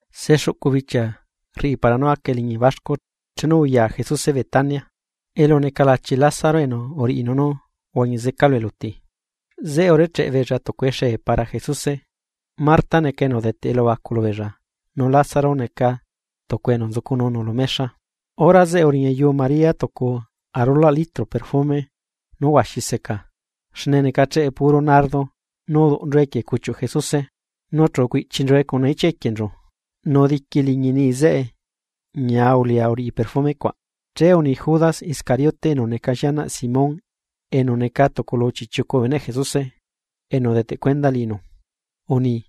Sexuꞌcu bichia rriꞌi para nú aca eliñi baxcu, chenu uya Jesuse Betania, elu neca lachi Lázaro enu uriꞌinu nú uhuañi zeca lu eluti. Zeꞌe urecheꞌ beella tucu exee para Jesuse, Marta neca enu udeteꞌ elubacu lubeella nu Lázaro neca tucu enu nzucununu lu mexa. Hora zeꞌe uriñayu María tucu arulaꞌ litro perfume nú huaxi seca xne necacheꞌe puro nardo nu uduꞌnchue equie cuchiu Jesuse, nu chu ucuiꞌchinchue cuna ichia equienchu. Nu diqui liñi niꞌi zeꞌe ñia ulia uriꞌi perfume cuaꞌ. Che uni Judas Iscariote enu neca llianaꞌ Simón enu neca tucu lu chiꞌchiucu bee beneꞌ Jesuse enu udeteꞌ cuenda liꞌinu, uni: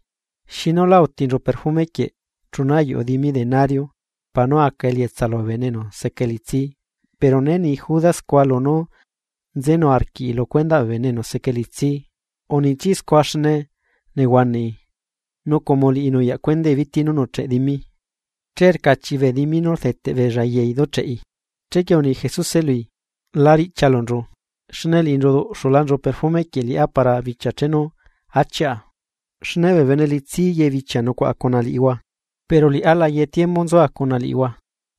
―¿Xinu lá autinchu perfume quieꞌ chuna ayuꞌu dimi denario para nú aca elietsa lubee bene enu seca elitsi? Pero né ni Judas scua lunú nzenu arquiꞌi lu cuendaꞌ bee bene enu seca elitsi, uniitsiai scua xne nehuanaꞌi nu como liꞌi nuyaꞌ cuendai biti nú nuꞌcheꞌ dimi, che rcachiꞌi bee dimi nú rdeteꞌ beella yai ducheꞌi. Chequie uni Jesuse lui: ―La riꞌchialunchu, xne liꞌinchu uduꞌxulanchu perfume quieꞌ liꞌá para bichia chenu achiꞌa. Xne bee bene elitsi ye bichia nucuaꞌa cuna liꞌihua, pero liꞌá la ye tiembu nzua cuna liꞌihua.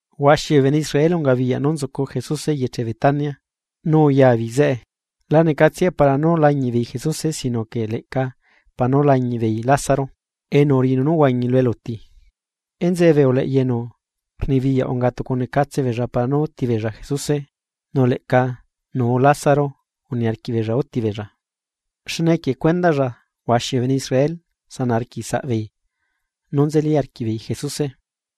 Huaxi bee bene Israel ungabiyaꞌ nú nzucu Jesuse eyeche Betania, uya beei zeꞌe. La necatsiae para nú lañiꞌbeei Jesuse sino que leꞌca para nú lañiꞌ beei Lázaro enu uriꞌinu nú uhuañi lu eluti. Enzeꞌe bee uleꞌya enu rnibiyaꞌ unga tucunecatse beella para nú úti beella Jesuse nu leꞌca nuu Lázaro uniarquiꞌ beella úti beella. Xne equie cuendaꞌlla huaxi bee bene Israel xiuꞌu leta beella, nu nzeli arquiꞌ beella Jesuse.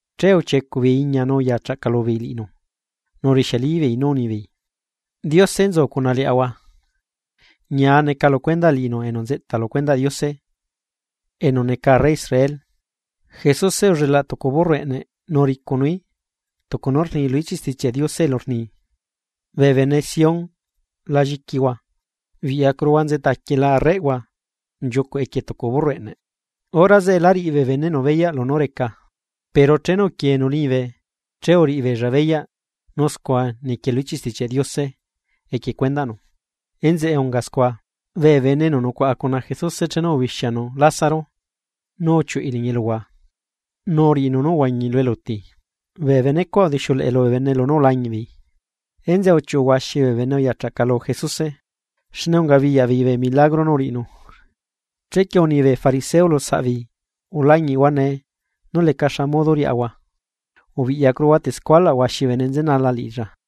Che uchiecuꞌ beei iña nu uya chaꞌcalu beei liꞌinu, nu urixialibeei nú unibeei: ―¡Diose nzu cuna liaꞌahua! ¡Ñia neca lu cuendaꞌ liꞌinu enu nzeꞌta lu cuendaꞌ Diose, enu neca Arre Israel! Jesuse ullelaꞌ tucu burro eꞌneꞌ nu uricunuí, tucu nú rni lu ichiꞌ Stichiaꞌ Diose elu rni: Bee bene Sión la lliquihua, biꞌyacuruhua nzeꞌtaquiela Arreꞌhua, nchiucuꞌ equie tucu burro eꞌneꞌ. Hora zeꞌe lá riꞌi bee beneꞌnu beyaꞌ lunú reca, pero chenu uquienu liñibe che uriꞌibeella beyaꞌ nú scua niquie lu ichiꞌ Stichiaꞌ Diose equie cuendaꞌnu, enzeꞌe unga scua. Bee bene enu nucuaꞌa cuna Jesuse chenu ubixianu Lázaro nú uchiuꞌui liñi eluhua, nu uriꞌinu nú uhuañi lu eluti, bee bene cuaꞌ udixiuleꞌe lubee bene lunú ulañiꞌbeei. Enzeꞌe uchiuꞌu huaxi bee bene uyachaꞌcalu Jesuse, xne ungabiyaꞌ beei bee milagro nú uriꞌinu. Chequie uni bee fariseo lu saꞌbeei ulañiꞌhuanee nú leca xa modo riaꞌahua: ―Biꞌyacuruhua tescualaꞌ huaxi bee bene nzenala liꞌilla.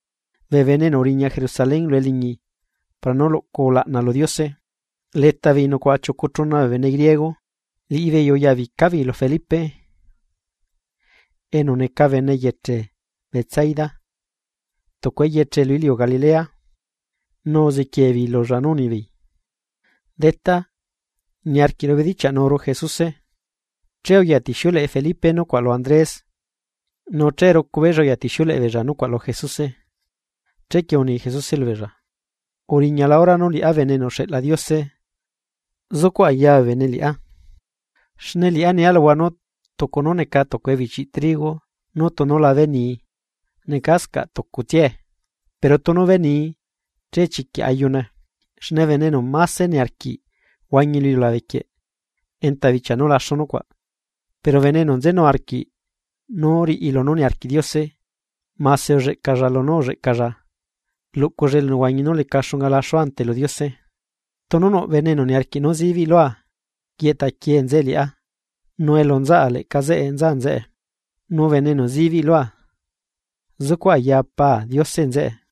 Bee bene enu uriña Jerusalén lu eliñi para nú luꞌcu ulaꞌna lu Diose, leta beei nucuaꞌa chiucu chuna bee bene griego. Liꞌibeei uyabica beei lu Felipe, enu neca bene eyeche Betsaida, tucu eyeche lu iliu Galilea, nu uzequiee beei lulla nú unibeei: ―Detá, niarquiꞌru bedichiaꞌnuru Jesuse. Che uyatixiuleꞌe Felipe nucuaꞌ lu Andrés nu che rucu beella uyatixiuleꞌe beella nucuaꞌ lu Jesuse. Chequie uni Jesuse lubeella: ―Uriñala hora nú liꞌá Bene enu uxeꞌla Diose, zucuꞌ aya bee bene liꞌá. Xne liꞌá nia luhua nú tucu nú neca tucu ebichi trigo nú tunu la benii, necascaꞌ tucutsiae, pero tunu benii che chiquiꞌ ayune. Xne bene enu máse niarquiꞌ huañi lu iliulabe quieꞌ, enta bichia nú laxu nucuaꞌ, pero bene enu nzenu arquiꞌ nú riꞌi lunú niarquiꞌ Diose mase ulleꞌcalla lunú ulleꞌcalla luꞌculla elunehuañi nú leca xunga laxu ante lu Diose. Tunu nuꞌ bene enu niarquiꞌ nú zibiꞌ lua, yeꞌtaquie nzeꞌe liꞌá, nu elu nzaꞌa leꞌca zeꞌe nza nzeꞌe. Nu bene enu zibiꞌ lua, zucuꞌ aya Pa Diose nzeꞌe.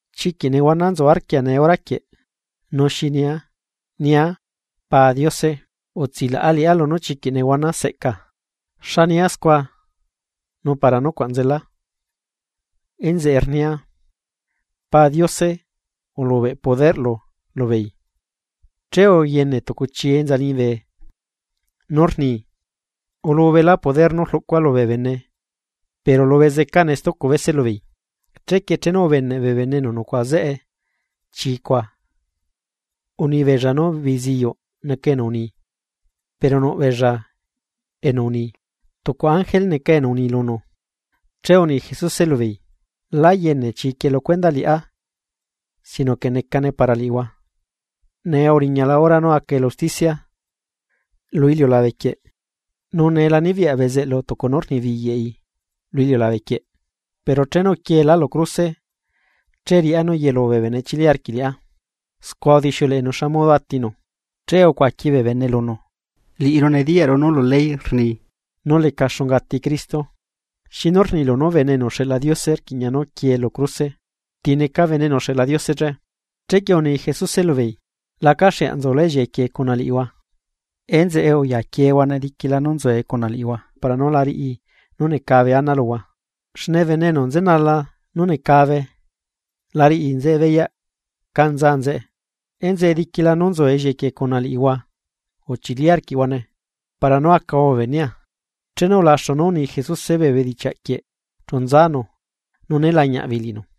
’¡Chiquiꞌ nehuana nzu arquia nee hora quieꞌ! ¿Nu xi nia? ¿Nia “Pa Diose, utsilaꞌa liꞌá lunú chiquiꞌ nehuana seꞌca”? ¡La nia scua xne para nucuaꞌ nzela! Enzeꞌe rnia, Pa Diose ulubeꞌ poderꞌlu lubeei. Che uyene tucu chii enza liñibe, nú rni: ―Ulubela poder nú rluꞌcua lubee bene pero lubezecane stucu bese lubeei. Chequie chenu ubeneꞌ bee bene enu nucuaꞌa zeꞌe chii cuaꞌ, uni beella nú biziyuꞌ neca enu uni, pero nuꞌ beella enu uni: ―Tucu ángel neca enu ni lunu. Che uni Jesuse lubeei: ―Lá yene chiquieꞌ lu cuendaꞌ liꞌá sino que necane para liꞌihua. Nee uriñala hora nú aca elu usticia lu iliulabequieꞌ nu nee la nibiyaꞌ bezeꞌlu tucu nú rnibiyaꞌi lu iliulabequieꞌ. Pero chenu uquieelá lu cruse, che riꞌá nú yelu bee bene chili arquiꞌ liꞌá. Scua udixiuleꞌenu xa modo atinu. Che ucuaqui bee bene lunu: ―Liꞌiru nediyaꞌru nú lu ley rni, nú leca xunga ati Cristo. ¿Xinu rnilu nú Bene enu uxeꞌla Diose rquiꞌña nú quiee lu cruse? ¿Ti neca Bene enu uxeꞌla Diose che? Chequie uni Jesuse lubeei: ―Lacaxeaꞌ nzulá ellieꞌe quieꞌ cuna liꞌihua, enzeꞌe uyaquiehuane diquila nú nzue cuna liꞌihua para nú la riꞌi nú necabe ana luhua xne bene enu nzenala nú necabe la riꞌi nzeꞌe beyaꞌ cá nza nzeꞌe. Enzeꞌe diquila nú nzu ellieꞌe quieꞌ cuna liꞌihua uchili arquiꞌhuane para nú acahua bee benea. Chenu ulaxu nú uni Jesuse bee bedichiaꞌquieꞌ chu nzanu nu né lañiaꞌ beei liꞌinu.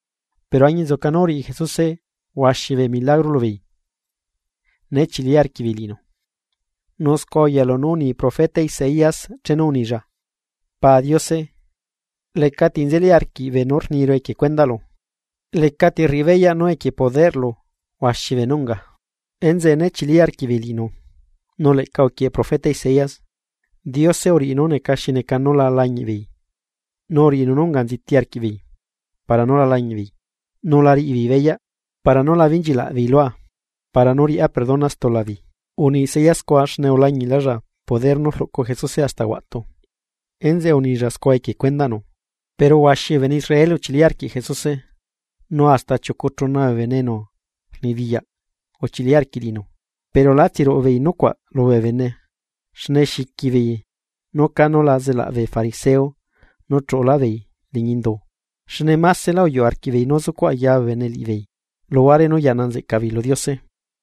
Pero añinzuca nú uriꞌi Jesuse huaxi bee milagro lubeei, né chili arquiꞌbeei liꞌinu. Nu scua uyalu nú uni profeta Isaías chenu unilla: Pa Diose, lecati nzeli arquiꞌ beenú rniru equie cuendaꞌlu. Lecati rriꞌi beyaꞌ nú equie poderꞌlu huaxi beenú unga. Enzeꞌe né chili arquiꞌbeei liꞌinu. Nu leꞌca uquieꞌe profeta Isaías: Diose uriꞌi nú neca xi neca nú la lañiꞌbeei, nu uriꞌinu nú unga nziti arquiꞌbeei, para nú la lañiꞌbeei, nu la riꞌibeei beyaꞌ, para nú la benchilaꞌbeei lua, para nú riꞌá perdona stula beei. Uni Isaías scua xne ulañiꞌlaꞌlla poder nú rluꞌcu Jesuse hasta huaꞌtu, enzeꞌe unilla scua equie cuendaꞌnu. Pero huaxi bee bene Israel uchili arquiꞌ Jesuse, nu hasta chiucu chuna bee bene enu rnibiyaꞌ uchili arquiꞌ liꞌinu. Pero lá tsiruꞌu beei nucuaꞌ lubee bene xne xiqui beei nú cánu la zelaꞌ bee fariseo nú chuꞌulá beei liñi indu. Xne másela uyuꞌu arquiꞌbeei nú zucuꞌ ayaa bee bene liꞌibeei, luhuare nú yaꞌna nzeꞌca beei lu Diose.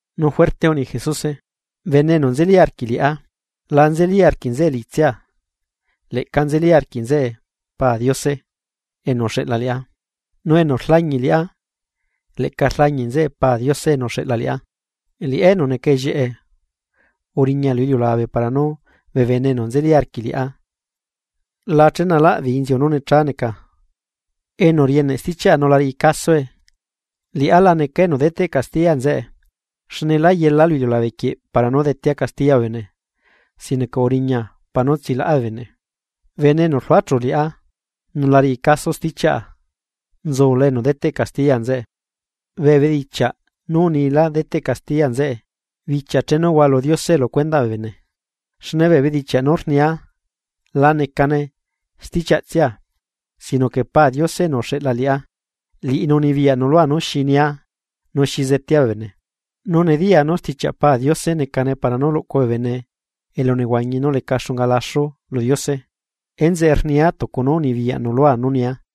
Nu juerte uni Jesuse: ―Bene enu nzeli arquiꞌ liꞌá, la nzeli arquiꞌ nzeꞌe liꞌitsia, leꞌca nzeli arquiꞌ nzeꞌe Pa Diose enu uxeꞌla liꞌá. Nu enu rlañiꞌ liꞌá, leꞌca rlañiꞌlaꞌ nzeꞌe Pa Diose enu uxeꞌla liꞌá. Liꞌá enu neca ellieꞌe, uriña lu iliulabe para nú bee bene enu nzeli arquiꞌ liꞌá, la chenalaꞌ beei inziu nú necha neca. Enu rieneꞌ stichiaꞌa nu la riꞌi casoe, liꞌá la necaa enu deteꞌ castiya nzeꞌe, xne lá yela lu iliulabe para nú detea castiya bee bene, sino que uriña para nú tsilaꞌa bee bene. Bene enu rluachu liꞌá, nu la riꞌi caso stichiaꞌa nzula enu deteꞌ castiya nzeꞌe, bee bedichiaꞌ nú unila deteꞌ castiya nzeꞌe bichia chenu hualu Diose lu cuendaꞌ bee bene. Xne bee bedichiaꞌ nú rnia la necane stichiaꞌtsia, sino que Pa Diose enu uxeꞌla liꞌá, liꞌinu unibiyaꞌnu lua nú xi nia nu xi zetea bee bene. Nu nediyaa nú stichiaꞌ Pa Diose necane para nú luꞌcu bee bene elunehuañi nú leca xunga laxu lu Diose. Enzeꞌe rnia tucu nú unibiyaꞌnu lua nú nia.